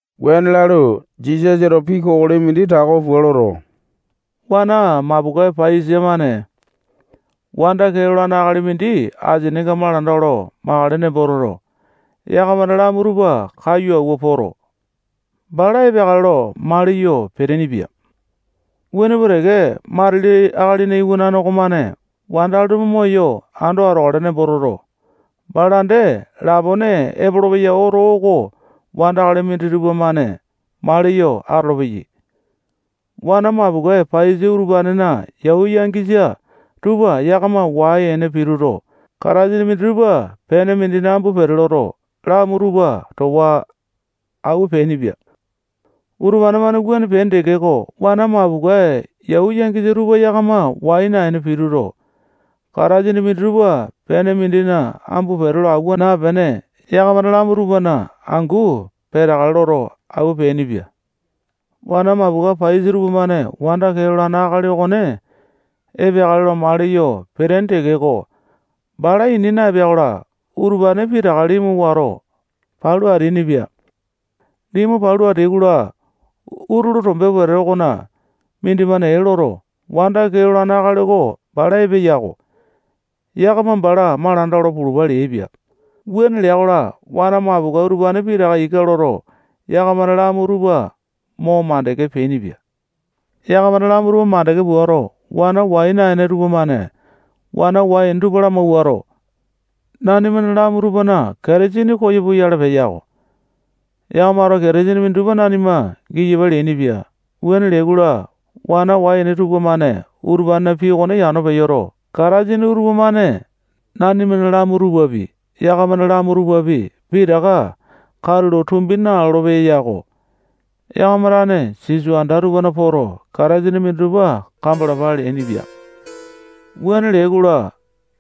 Wuane lalu, Jisasato pii kokoli mindi tako pua loto, wana mapokae paiyasa-mane wanda kee lolane akali mindi asininga malanda olo makale nembo toto, yakamana lamu tupa kaiyu awua poto, bala epeakale lo maliyo peteaini-pia. Wuane pua teke, matili Akalina Iwanane okomane wandakali tupa moyo ando atokale nembo toto, bala dee lapone epolopeya oto oko wandakali minditupa-mane maliyo atolopeyai. Wana mapokae paiyasa utupanena yau yangisa tupa yakama wai-ene pituto, katasini minditupa pene mindina ambu pete loto, lamu tupa towa awua peainipia. Utupane-mane wuane peaini tekeko, wana mapokae yau yangisa tupa yakama wai naene pituto, katasini minditupa pene mindina ambu pete lo awua naepene, yakamana lamu tupana angu peteakale loto, awua peainipia. Wana mapokae paiyasa tupamane wanda kee lolane akali okone epeakale lo maliyo peteaini tekeko, bala ini naepea-kola, utupane pitaka limu wato, palu ateainipia. Limu palu ateai-kola, utulu tombe wete okona mindimane ee loto, wanda kee lolane akali oko bala epeya-ko. Yakama bala malanda olo pulupa leaipia. Wuane lea-kola, wana mapokae utupane pitaka ika loto, yakamana lamu tupa mo mandeke peainipia. Yakamana lamu tupa mandeke puato, wana wai naene tupamane wana wai-ene tupa lamawuato, nanimana lamu tupana katasini koyo puyale peya-ko. Yakamato katasini minditupa nanima giyapa leainipia. Wuane leai-kola, wana wai-ene tupamane utupanena pii okone yano peyoto, katasini utupa-mane nanimana lamu tupapi, yakamana lamu tupapi, pitaka katulo tumbi nalolo-peya yako. Yakama tane sisoa anda tupana poto, katasini minditupa kambalapa leainipia. Wuane leai-kola,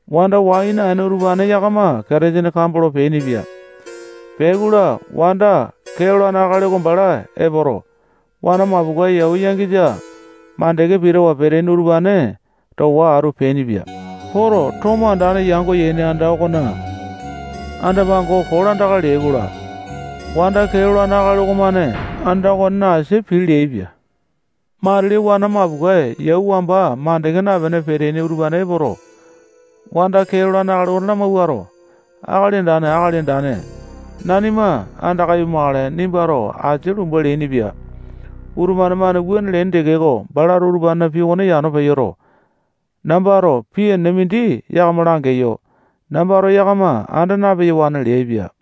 wanda wai naene utupane yakama katasini kambolo peainipia. Peai-kola, wanda kee lolane akali okone bala epoto, wana mapokae yau yangisa makande pitawa peteaini utupane towa atu peainipia. Poto, wanda kee lolane tomo andane yango yaini anda okona anda-pango kolandaka leai-kola, wanda kee lolane akali okomane anda okonena asia pii leaipia. Matili wana mapokae yau wamba mandeke napene peteaini utupane epoto, wanda kee lolane akali okone lamawuato, akali andane, akali andane, nanima andaka ipumakale, nimbato asia lumba leainipia. Utupane-mane wuane leaini tekeko, balato utupanena pii okone yano peyoto, nambato pii enene mindi yakama langeyo. Nambato yakama anda na-peyawane leaipia.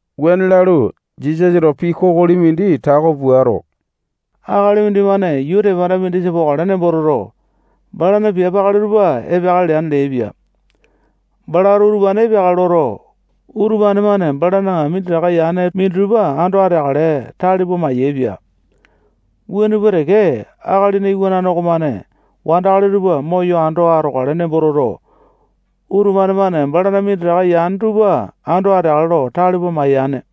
Wuane lalu, Jisasato pii kokoli mindi tako puato, akali mindimane yuu tepanda mindisa pokale nembo toto, balana piape akali tupa epeakale leane leaipia. Balato utupane epeakale loto, utupane-mane balana minditaka yane tupana minditupa ando ateakale lo tale pua mayaepia. Wuane pua teke, Akalina Iwanane okomane wandakali tupa moyo ando atokale nembo toto, utupane-mane balana minditaka yane tupa ando ateakale lo tale pua mayane.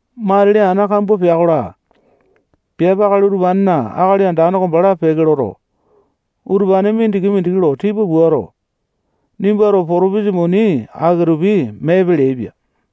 Matili ana kambua pea-kola, piape akali utupanena akali andane oko bala peke loto, utupane mindiki-mindiki lo tipa puato, nimbato potopisa muni aki-tupi meepe leaipia.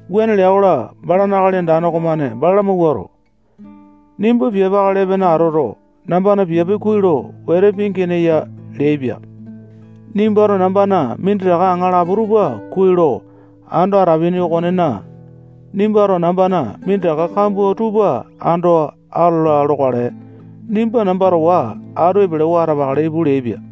Wuane lea-kola, balana akali andane okomane bala lamawuato, nimba piape akali epene atoto, nambana piape kuai lo wete pingeene ya leaipia. Nimbato nambana minditaka aŋalapo tupa kuai lo ando atapini okonena, nimbato nambana minditaka kambua tupa ando atola lokale. Nimba namba towa atu epelewa atapakale ipu leaipia.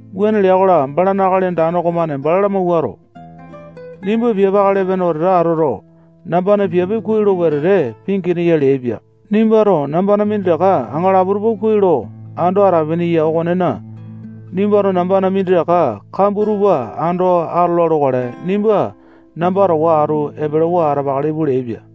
Wuane lea-kola, balana akali andane okomane bala lamawuato, nimba piape akali epene atoto, nambana piape kuai lo wete pingeene ya leaipia. Nimbato nambana minditaka aŋalapo tupa kuai lo ando atapini okonena, nimbato nambana minditaka kambua tupa ando atola lokale. Nimba namba towa atu epelewa atapakale ipu leaipia.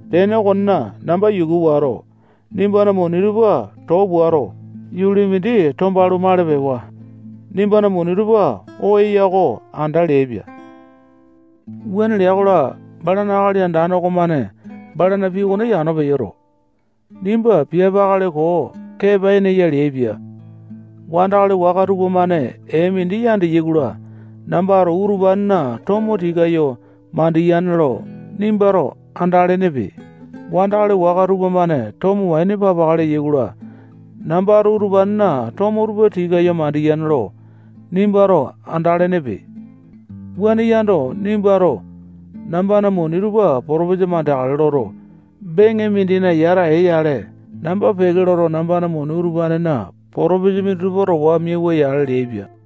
Tene okonena, namba yuku wato, nimbana muni tupa too puato, yuli mindi tombalu, mali pewa. Nimbana muni tupa oo eya oko anda leaipia. Wuane lea-kola, balana akali andane okomane balana pii okone yano peyoto, nimba piape akali koo kepa-ene ya leaipia. Wandakali waka tupamane ee mindi yandeyai-kola, nambato utupanena tomo tikayu mandiyane lo nimbato andalenepe. Wandakali waka tupamane tomo waini papaka leyai-kola, nambato utupanena tomo tupa tikayu mandiyane lo nimbato andalenepe. Wuane yando, nimbato nambana muni tupa potopisa mandeakale loto, beŋe mindina yata ee-yale, namba peke loto, nambana muni utupana potopisa minditupa towa miauwa-yale leaipia.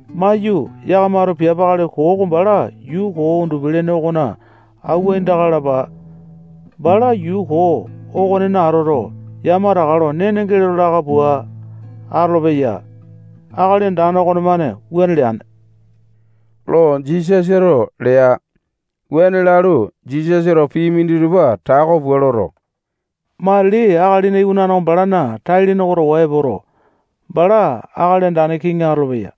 Maiyu, yakamato piape akali koo oko bala yuu koo undupi-lene okona awua aindaka lalapa. Bala yuu koo okonena atoto, yamataka lo nene geleto laka pua atolopeya. Akali andane okonemane wuane leane lo Jisasato lea. Wuane lalu, Jisasato pii minditupa tako pua loto, matili Akalina Iwanane oko balana tai-lene oko towa epoto, bala akali andane kiŋi atolopeya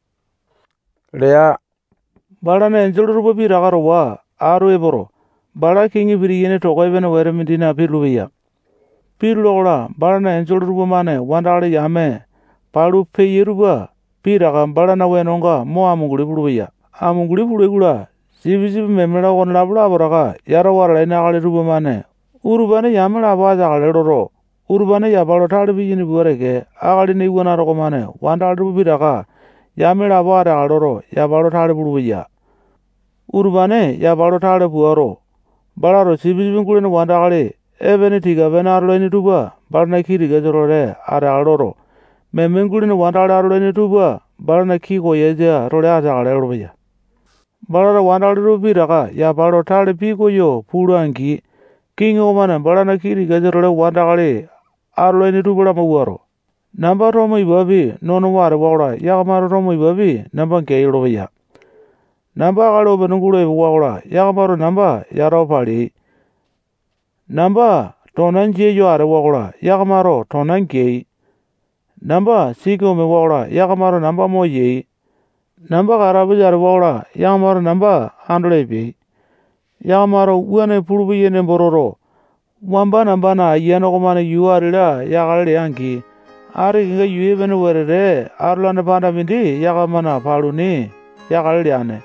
lea. Balana enjole tupa pitaka towa atu epoto, bala kiŋi pitiyane toko epene wete mindina pitulu-peya. Pitula-kola, balana enjole tupamane wandakali yame palu peyai tupa pitaka balana wenonga mo amunguli pulupeyai. Amunguli pulai-kola, sipisipi, meme-la, okonelapo lapotaka yatawa atalaini akali tupamane utupane yame lapo ateakale loto, utupane yapa lo tale piyaini pua teke, Akalina Iwanane okomane wandakali tupa pitaka yame lapo ateakale loto, yapa lo tale pulupeya. Utupane yapa lo tale puato, balato sipisipi gulene wandakali epene tika-pene atolaini tupa balana kii tikasa-tole ateakale loto, meme gulene wandakali atolaini tupa balana kii koyasa-tole ateakale lolopeya. Balato wandakali tupa pitaka yapa lo tale pikoyo pula-angi, kiŋi okomane balana kii tikasa-tole wandakali atolaini tupa lamawuato, namba tomo ipapi nonowa atewa-kola, yakamato tomo ipapi namba geai lolopeya. Namba akali opene gulo epewa-kola, yakamato namba yatawa paleai. Namba tona jia yo atewa-kola, yakamato tona geai. Namba siki omewa-kola, yakamato namba moyai. Namba katapusa atewa-kola, yakamato namba andolo epeai. Yakamato wuane pulupeyai nembo toto, wamba nambana ayiane okomane yuu ati-la yakale lea-angi, ati kenga yuu epene wetete atolane panda mindi yakamana paluni yakale leane.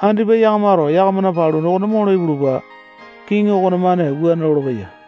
Andipa yakamato yakamana paluni okone molo ipulupa. Kiŋi okonemane wuane lolopeya.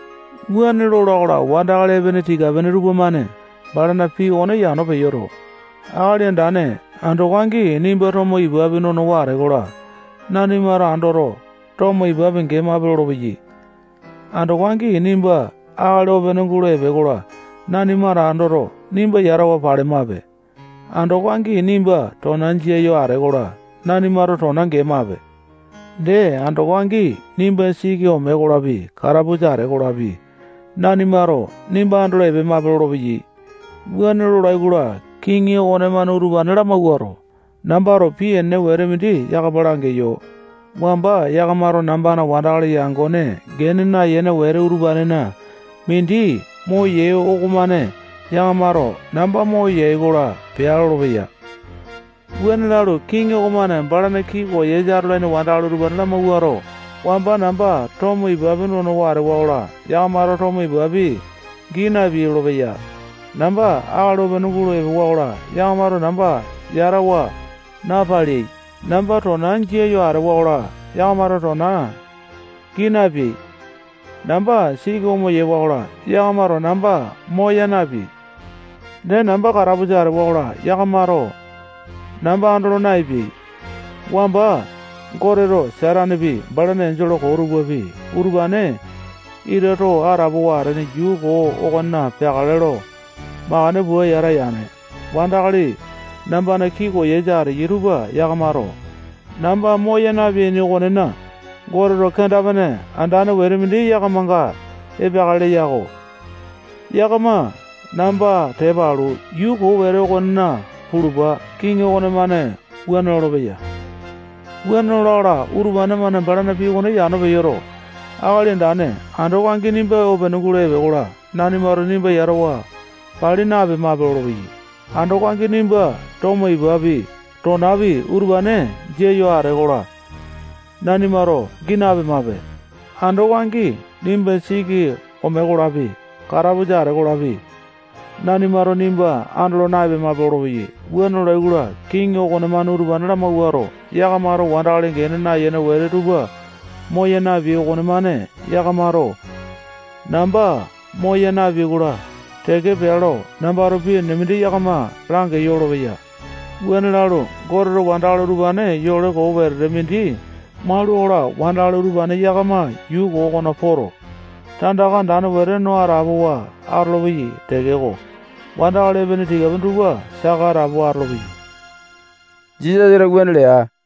Wuane lola-kola, wandakali epene tika-pene tupamane balana pii okone yano peyoto, akali andane, andoko angi nimba tomo ipapi nonowa atee-kola, nanimato andoto, tomo ipapi gemape lolopeyai. Andoko angi nimba akali opene gulo epee-kola, nanimato andoto, nimba yatawa palemape. Andoko angi nimba tona jia yo atee-kola, nanimato tona gemape. Dee, andoko angi nimba siki omee-kolapi, katapusa atee-kolapi, nanimato nimba andolo epemape lolopeyai. Wuane lolai-kola, kiŋi okonemane utupane lamawuato, nambato pii enene mindi yakama langeyo. Wamba yakamato nambana wandakali yangone gene nayene wete utupanena mindi moyai okomane yakamato namba moyai-kola peai lolopeya. Wuane lalu, kiŋi okomane balana kii koyasa atolaini wandakali utupane lamawuato, wamba namba tomo ipapi nonowa atewa-kola, yakamato tomo ipapi gii napeai lolopeya. Namba akali opene gulo epewa-kola, yakamato namba yatawa napaleai. Namba tona jia yo atewa-kola, yakamato tona gii napeai. Namba siki omewa-kola, yakamato namba moya napeai. Dee, namba katapusa atewa-kola, yakamato namba andolo naepeai. Wamba Goteto Satanepi, balana enjole koo tupapi, utupane ita too atapowa atene yuu koo okona peakale lo makande pua yata yane. Wandakali nambana kii koyasa ateyai tupa yakamato namba moya napeaini okonena, Goteto kenda-pene andane wete mindi yakamanga epeakale leya-ko. Yakama namba tepa alu, yuu koo wete okonena pulupa. Kiŋi okonemane wuane lolopeya. Wuane lola-kola, utupane-mane balana pii okone yano peyoto, Akali andane, andoko angi nimba opene gulo epee-kola, nanimato nimba yatawa pali napemape lolopeyai. Andoko angi nimba tomo ipapi, tonapi, utupane jia yo atee-kola, nanimato gii napemape. Andoko angi nimba siki omee-kolapi, katapusa atee-kolapi, nanimato nimba andolo na-epemape lolopeyai. Wuane lolai-kola, kiŋi okonemane utupane lamawuato, yakamato wandakali gene nayene wete tupa moya napeai okonemane yakamato namba moya napeai-kola teke pea lo nambato pii enene mindi yakama langeyo lolopeya. Wuane lalu, Goteto wandakali utupane yole koo wetete mindi maula-kola, wandakali utupane yakama yuu koo okona poto, tandaka andane wete no atapowa atolopeyai tekeko, wandakali epene tika-pene tupa saka atapowa atolopeyai. Jisasato wuane lea.